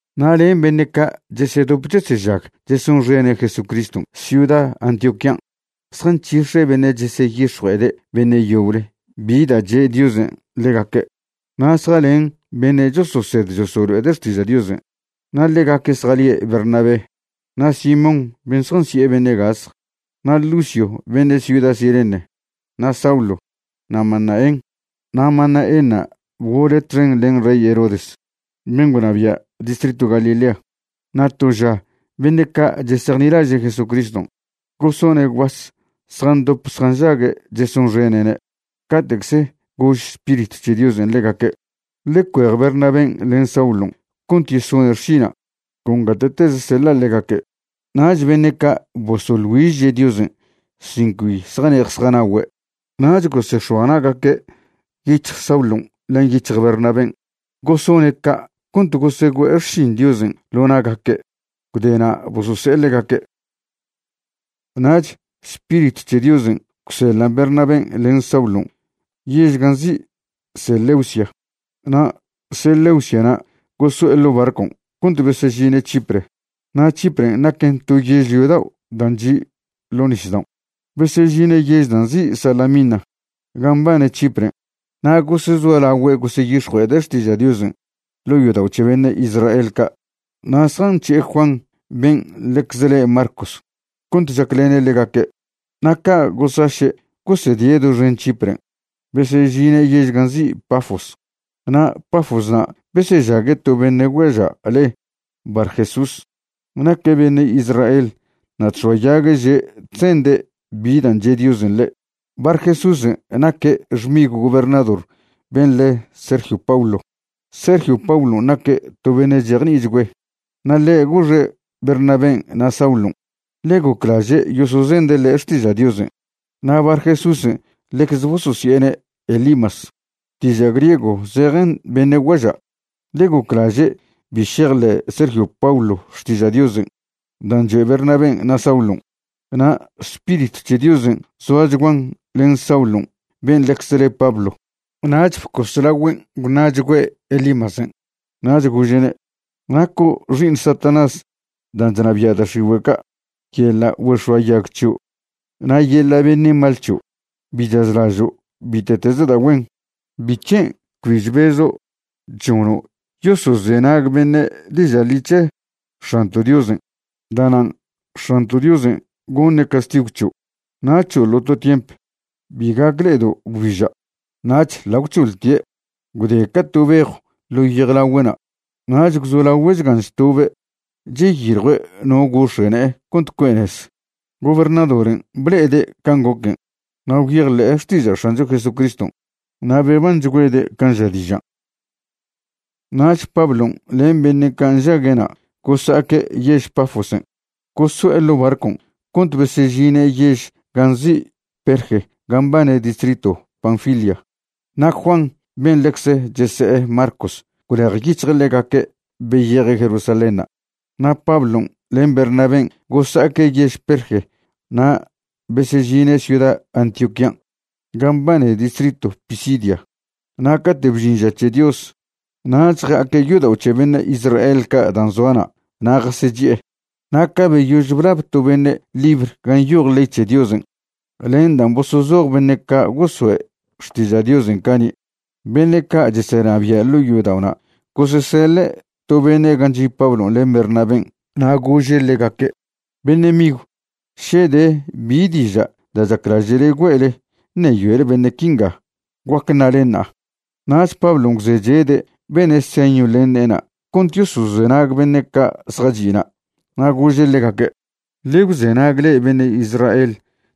Na' len beṉe' ca' chesedop chesežag chesonxene' Jesucriston' ciuda Antioquían' zjanc̱hix̱e beṉe' cheseyix̱jue'ede' beṉe' yoble bi da' che' Diosen' ḻegaque', na' zjalen beṉe' chososed chosolo'ede' xtiža' Diosen'. Na' ḻegaque' zjalie' Bernabé, na' Simón ben' zjansi'e beṉe' gasj, na' Lucio beṉe' ciuda Cirene, na' Saulo, na' Manaén. Na' Manaénṉa' bgole' txen len rey Herodes ben' gwnabia' distritw Galilea. Na' to ža beṉe' ca' chesejnilaže' Jesucriston' gosone' gwbas zjandop zjanžague' chesonxene'ne' cate'cze gož Spiritw c̱he Diosen' ḻegaque': ―Ḻe cuej Bernabén' len Saulon' cont yesone' xšina' con gate'teze seḻa' ḻegaque'. Nach beṉe' ca' bosoḻ güižche' Diosen' sin cbi zjane'ej zjanagüe', nach gosex̱oa na'gaque' yic̱hj Saulon' len yic̱hj Bernabén', gosone' ca' cont gosegüe'e xšin Diosen' ḻo na'gaque'. Gwdena' bosose'e ḻegaque'. Nach Spiritw c̱he Diosen' gwseḻan' Bernabén' len Saulon' yež gan' nzi' Seleucia. Na' Seleuciana' goso'e ḻo' barcon' cont besežine' Chipre. Na' Chipren' naquen to yežlio dao' dan' chi' ḻo' nisdaon'. Besežine' yež dan' nzi' Salamina gan' mbane Chipren' na' gosezolagüe' goseyix̱jue'ede' xtiža' Diosen' ḻo' yodao' c̱he beṉe' Israel ca'. Na' zjanc̱he'e Juan ben' ḻecze le Marcos cont chaclene' ḻegaque'. Na' ca' gosaše' gosedie' doxen Chipren' besežine' yež gan' nzi' Pafos. Na' Pafosna' besežague' to beṉe' guaža' le Barjesús. Naque' beṉe' Israel na' chx̱oayague' že' chzende' bi dan' che' Diosen' ḻe'. Barjesúsen' naque' xmigw gobernador ben' le Sergio Paulo. Sergio Paulon' naque' to beṉe' chejni'ichgüe'. Na' ḻe' goxe' Bernabén' na' Saulon', ḻe goclaže' yosozende' ḻe' xtiža' Diosen'. Na' Barjesúsen' ḻecze bososi'ene' Elimas, diža' griego zejen beṉe' guaža'. Ḻe' goclaže' bi šejḻe' Sergio Paulo xtiža' Diosen' dan' choe' Bernabén' na' Saulon'. Na' Spiritw c̱he Diosen' zoachguan len Saulon' ben' ḻecze le Pablo, nach bcos lagüen' gwṉa'chgüe' Elimasen'. Nach gože'ne': ―Naco' xi'iṉ Satanás dan' chnabia' da' x̱igüe' ca', yeḻa' güex̱oayag c̱hio' na' yeḻa' beṉe' mal c̱hio'. Bi chazlažo' bite'teze da' güen. ¿Bic̱hen' cbi chbezo' chžono' yosozenag beṉe' diža' ḻi c̱he X̱anto' Diosen'? Da'nan' X̱anto' Diosen' goṉe' castigw c̱hio' na' c̱hoḻo' to tiemp, bi gac le'edo' gwbiža'. Nach ḻa' gwc̱hoḻtie', gwde ca to bejw ḻo yejlagüe'na', nach gwzolagüe' chgan chtobe' cheyiljue' no gox̱e' ne'e cont cue' nez. Gobernadoren' ble'ede' can' goquen' na' gwyejḻe'e xtiža' X̱ancho Jesucriston', na' bebanchgüede' can' ža dižan'. Nach Pablon' len beṉe' ca' nžague'na' gosa'aque' yež Pafosen', goso'e ḻo' barcon' cont besežine' yež gan' nzi' Perge gan' mbane distritw Panfilia. Na' Juan ben' ḻecze chese'e Marcos gwlejyic̱hje' ḻegaque' beyeje' Jerusalénṉa'. Na' Pablon' len Bernabén' gosa'aque' yež Perge na' besežine' ciuda Antioquían' gan' mbane distritw Pisidia. Na' cate' bžin ža c̱he Dios nach ja'aque' yodao' c̱he beṉe' Israel ca' dan' zoa na' na' jasechi'e. Na' ca beyož blab to beṉe' libr gan' nyoj ley c̱he Diosen' len dan' bosozoj beṉe' ca' goso'e xtiža' Diosen' cani', beṉe' ca' chesenabia' ḻo yodao'na' goseseḻe' to beṉe' gan' chi' Pablon' len Bernabén' na' gože' ḻegaque': ―Beṉe' migw, še de bi diža' da' chaclaže'le güe'le ṉeyoele beṉe' quinga, guac ṉalen ṉa'a. Nach Pablon' gwzechede' bene' señw len ne'ena' cont yosozenag beṉe' ca' zjachi'na', na' gože' ḻegaque': ―Ḻe gwzenag le'e beṉe' Israel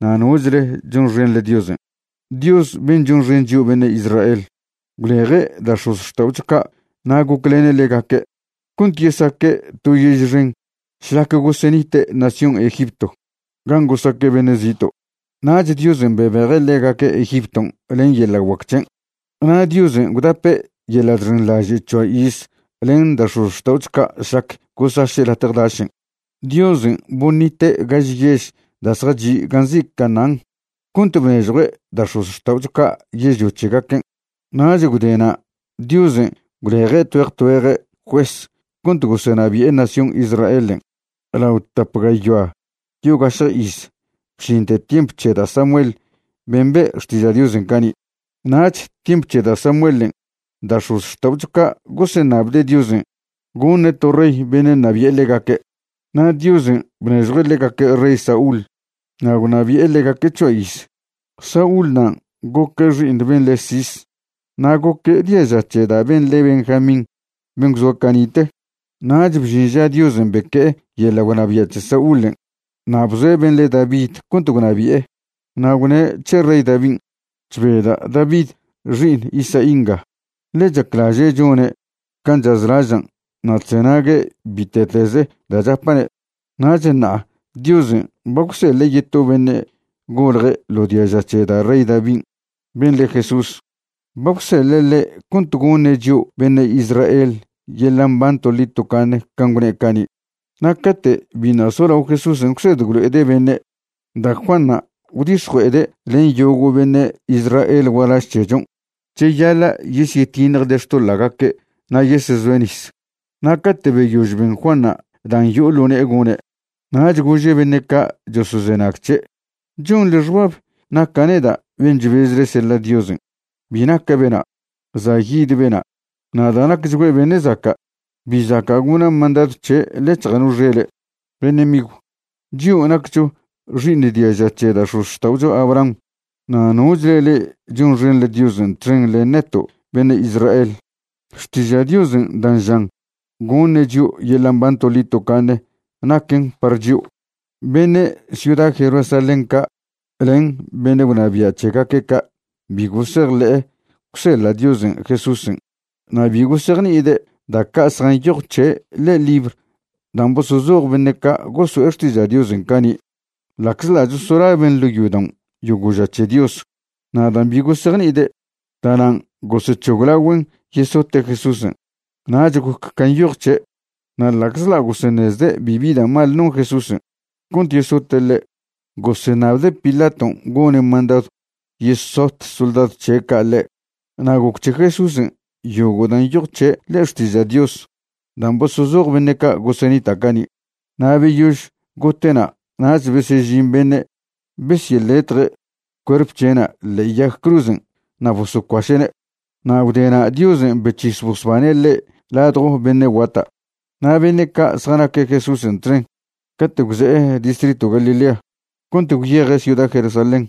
na' nochle chonxenḻe Diosen'. Dios ben' chonxen chio' beṉe' Israel gwleje' da' x̱ozxta'ocho ca' na' goclene' ḻegaque' cont yesaque' to yež xen šlac gosenite' nación Egipto gan' gosaque' beṉe' zito'. Nach Diosen' bebeje' ḻegaque' Egipton' len yeḻa' guac c̱hen'. Na' Diosen' gwdape' yeḻa' chxenḻaže' c̱hoa iz len da' x̱ozxta'ocho ca' šlac gosaše' latje dašen'. Diosen' boṉite' gaž yež da' zjachi' gan' nzi' Canaán cont bnežjue' da' x̱ozxta'ocho ca' yežlio c̱hegaquen'. Nach gwde na' Diosen' gwleje' tgüeje tgüeje juez cont gosenabi'e nación Israelen' lao tap gayoa yogašje iz bžinte tiemp c̱he da' Samuel ben' be'e xtiža' Diosen' cani'. Nach tiemp c̱he da' Samuelen' da' x̱ozxta'ocho ca' goseṉabde' Diosen' goṉe' to rey beṉe' ṉabi'e ḻegaque'. Na' Diosen' bnežjue' ḻegaque' rey Saúl na' gwnabi'e ḻegaque' c̱hoa iz. Saúl nan' goque' xi'iṉ ben' le' Cis, na' goque' diaža c̱he da' ben' le Benjamín ben' gwzoa cani'te. Nach bžin ža Diosen' beque'e yeḻa' gwnabia' c̱he Saúlen' na' bzoe' ben' le David cont gwnabi'e. Na' gwne' c̱he rey Davin': “Chbeda' David xi'iṉ Isaí nga, ḻe chaclaže' chone' can' chazlažan' na' chzenague' bite'tez da' chapa'ne'.” Nach ṉa'a Diosen' ba gwseḻe' yeto beṉe' golje' ḻo diaža c̱he da' rey Davin', ben' le Jesús. Ba gwseḻe' ḻe' cont goṉe' chio' beṉe' Israel yeḻa' mban toḻi tocaṉe can' gwne' cani'. Na' cate' biṉa' solao Jesúsen' gwsed gwlo'ede' beṉe', da' Juanṉa' gwdix̱jue'ede' len yogo' beṉe' Israel gualaž c̱hechon' cheyaḻa' yesyetiṉjde' xtoḻa'gaque' na' yesezoe' nis. Na' cate' beyož ben Juanṉa' dan' yo'o ḻo ne'e gone', nach gože' beṉe' ca' chosozenag c̱he': “¿Chonḻe xbab naca' neda' ben' chbezle seḻa' Diosen'? Bi naca' bena'. Za' yid bena', na' da' nacchgüe' beṉe' zaca', bi zaca' gona' mandadw c̱he' ḻec̱hja' no xele'.” ’Beṉe' migw, chio' naccho xi'iṉ diaža c̱he da' x̱ozxta'ocho Abraham, na' nochle le'e chonxenḻe Diosen' txen len neto' beṉe' Israel, xtiža' Diosen' dan' žan goṉe' chio' yeḻa' mban toḻi tocaṉe naquen par chio'. Beṉe' ciuda Jerusalén ca' len beṉe' gwnabia' c̱hegaque' ca' bi gosejḻi'e gwseḻa' Diosen' Jesúsen', na' bi gosejni'ide' da' ca' zjanyoj c̱he' ḻe'e libr dan' bosozoj beṉe' ca' goso'e xtiža' Diosen' cani' ḻa'czḻa' chosolaben' ḻo' yodaon' yogo' ža c̱he Dios. Na' dan' bi gosejni'ide', da'nan' gosec̱hoglagüen' yesote' Jesúsen', nach goc can' nyoj c̱he'. Na' ḻa'czḻa' goseṉezde' bibi da' mal non Jesúsen' cont yesote' ḻe', goseṉabde' Pilaton' gone' mandadw yesot soldadw c̱he' ca' ḻe'. Na' goc c̱he Jesúsen' yogo' dan' nyoj c̱he' ḻe'e Xtiža' Dios dan' bosozoj beṉe' ca' gosenita' cani'. Na' beyož gote'na' nach besežin beṉe' besyeḻetje' cuerp c̱he'na' ḻe'e yag cruzen' na' bosocuaše'ne'. Na' gwdena' Diosen' bec̱his bosbane' ḻe' ladjo beṉe' guata'. Na' beṉe' ca' zjanaque' Jesúsen' txen cate' gwze'e distritw Galilea cont gwyeje' ciuda Jerusalén,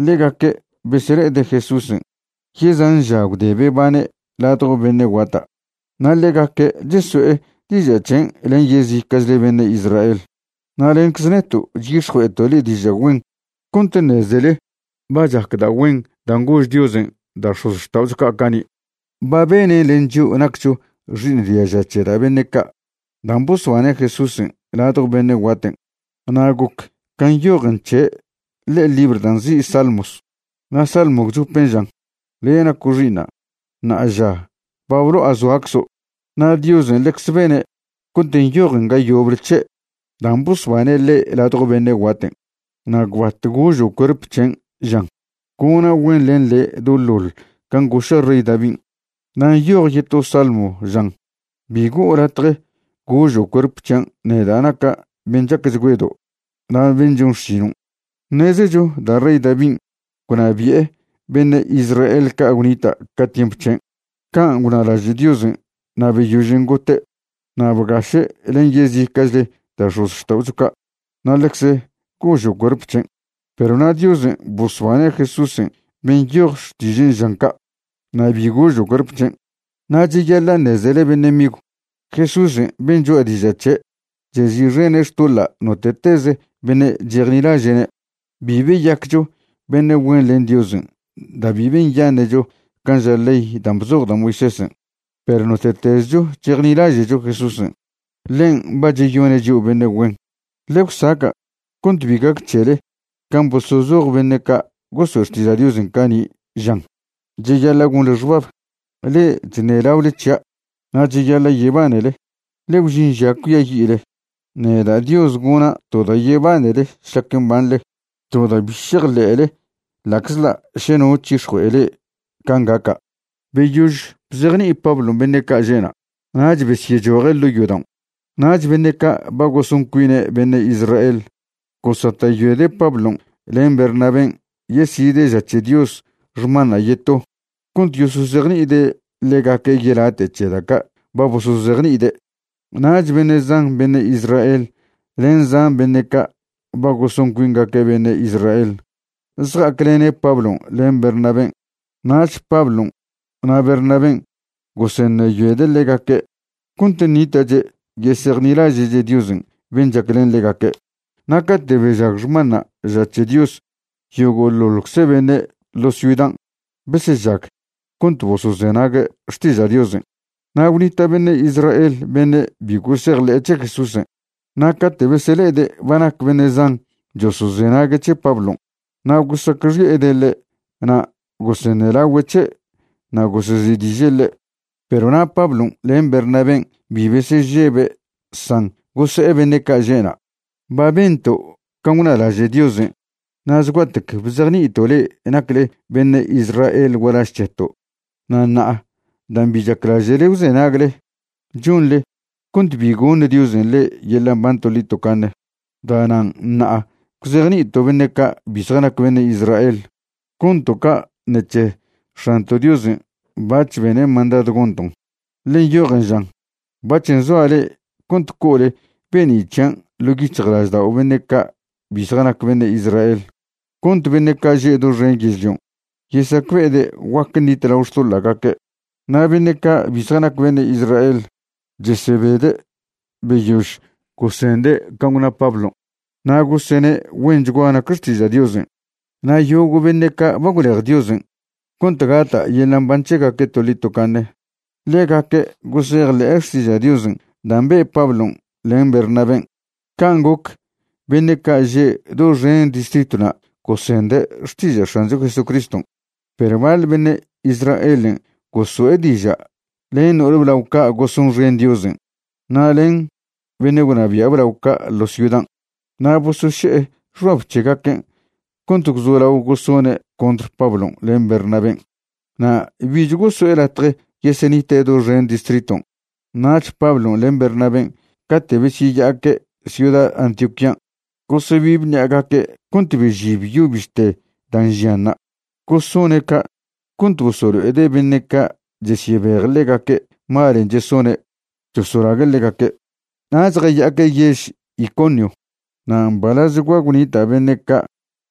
ḻegaque' besele'ede' Jesúsen' yezan ža gwde bebane' ladjo beṉe' guata', na' ḻegaque' cheso'e diža' c̱hen' len yezica'chle beṉe' Israel. ’Na' lencze neto' chyix̱jue'eto' le'e diža' güen cont ṉezele ba chac da' güen dan' gož Diosen' da' x̱ozxta'ocho ca' cani'. Ba benen' len chio' naccho xi'iṉ diaža c̱he da' beṉe' ca', dan' bosbane' Jesúsen' ladjo beṉe' guaten'. Na' goc can' nyojen c̱he' ḻe'e libr dan' nzi' Salmos, na' salmo gwchopen' žan: “Le' naco' xi'iṉa'; ṉa'aža ba blo'a zoaczo'.” Na' Diosen' ḻecze bene' cont nyojen ga yoble c̱he' dan' bosbane' ḻe' ladjo beṉe' guaten' na' gwbat gožo' cuerp chen', žan: “Gona' güen len le' doḻoḻ can' goša' rey Davin'.” Na' nyoj yeto salmo žan: “Bi go'o latje gožo' cuerp c̱hian' neda' naca' ben' chacchgüedo' na' ben' chon xšinon'.” Ṉezecho da' rey Davin' gwnabi'e beṉe' Israel ca' gwnita' ca tiemp c̱hen' can' gwnalaže' Diosen' na' beyožen' gote' na' bgaše' len yezica'chle da' x̱ozxta'ocho ca' na' ḻecze gožo' cuerp c̱hen'. Perw na' Diosen' bosbane' Jesúsen' ben' nyoj Xtižen' žan ca', na' bi gožo' cuerp c̱hen'. Na' cheyaḻa' ṉezele beṉe' migw, Jesúsen' ben' choa' diža' c̱he', chezi'xene' xtoḻa' note'tez beṉe' chejnilaže'ne'. Bi beyaccho beṉe' güen len Diosen' da' bi benyaṉe'cho can' ža ley dan' bzoj da' Moisésen', perw note'tezcho chejnilaže'cho Jesúsen', ḻen' ba cheyone' chio' beṉe' güen. Ḻe gwsaca' cont bi gac c̱hele can' bosozoj beṉe' ca' goso'e xtiža' Diosen' cani', žan: Cheyaḻa' gonḻe xbab, le'e chṉelaole c̱hia', na' cheyaḻa' yebanele, ḻe gwžin ža cuiayi'le. Neda' Dios gona' to da' yebanele šlac mbanḻe, to da' bi šejḻe'le ḻa'czḻa' še no c̱hix̱jue'e le'e can' gaca'. Beyož bzejni'i Pablon' beṉe' ca' že'na' nach besyechoje' ḻo' yodaon'. Nach beṉe' ca' ba goson cuine' beṉe' Israel gosata'yoede' Pablon' len Bernabén' yeside' ža c̱he Dios xmanṉa' yeto cont yosozejni'ide' ḻegaque' yelate' c̱he da' ca' ba bosozejni'ide'. Nach beṉe' zan beṉe' Israel len zan beṉe' ca' ba goson cuingaque' beṉe' Israel zja'aclene' Pablon' len Bernabén'. Nach Pablon' na' Bernabén' goseṉeyoede' ḻegaque' cont ṉita'che' yesejnilaže'che' Diosen' ben' chaclen ḻegaque'. Na' cate' bežag xmanṉa' ža c̱he Dios yogo'ḻoḻcze beṉe' ḻo ciudan' besežag cont bosozenague' xtiža' Diosen'. Na' gwnita' beṉe' Israel beṉe' bi gosejḻe' c̱he Jesúsen', na' cate' besele'ede' ba nac beṉe' zan chosozenague' c̱he Pablon' na' gosacxi'ede' ḻe' na' goseṉelagüe' c̱he' na' gosezi'diže' ḻe'. Perw na' Pablon' len Bernabén' bi besežebe' san gose'e beṉe' ca' že'na': ―Ba bento' can' gwnalaže' Diosen' na' zgua'tec bzejni'ito' le'e nacle beṉe' Israel gualaž c̱heto'. Na' ṉa'a dan' bi chaclaže'le gwzenagle, chonḻe cont bi goṉ Diosen' le'e yeḻa' mban toḻi tocaṉe. Da'nan' ṉa'a gwzejni'ito' beṉe' ca' bi zjanac beṉe' Israel. Gonto' ca' ṉec̱he X̱anto' Diosen' bac̱h bene' mandadw gonton', ḻe nyojen žan: Bac̱h nzoa' le'e cont co'ole be'ni' c̱hian' ḻo' yic̱hjlaždao' beṉe' ca' bi zjanac beṉe' Israel, cont beṉe' ca' že' doxen yežlion' yesacbe'ede' guac ṉitlao xtoḻa'gaque'. Na' beṉe' ca' bi zjanac beṉe' Israel chesebede' beyož gosende' can' gwna Pablon', na' gosene' güenchgua nac xtiža' Diosen'. Na' yogo' beṉe' ca' ba gwlej Diosen' cont gata' yeḻa' mban c̱hegaque' toḻi tocaṉe, ḻegaque' gosejḻe'e xtiža' Diosen' dan' be' Pablon' len Bernabén'. Can' goc beṉe' ca' že' doxen distritwna' gosende' xtiža' X̱ancho Jesucriston'. Perw baḻ beṉe' Israelen' goso'e diža' len no'ol blao ca' gosonxen Diosen' na' len beṉe' gwnabia' blao ca' ḻo ciudan', na' bosoše'e xbab c̱hegaquen' cont gwzolao gosone' contr Pablon' len Bernabén' na' bich goso'e latje yesenite' doxen distriton'. Nach Pablon' len Bernabén' cate' besyeya'aque' ciuda Antioquían' gosebibe ṉi'agaque' cont bežib yo bište dan' žianṉa'. Gosone' ca' cont bosolo'ede' beṉe' ca' chesyebej ḻegaque' malen' chesone' chosolague' ḻegaque'. Nach jaya'aque' yež Iconio. Na' mbalazchgua gwnita' beṉe' ca'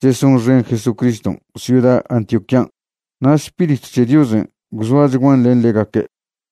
chesonxen Jesucriston' ciuda Antioquían', na' Spiritw c̱he Diosen' gwzoachguan len ḻegaque'.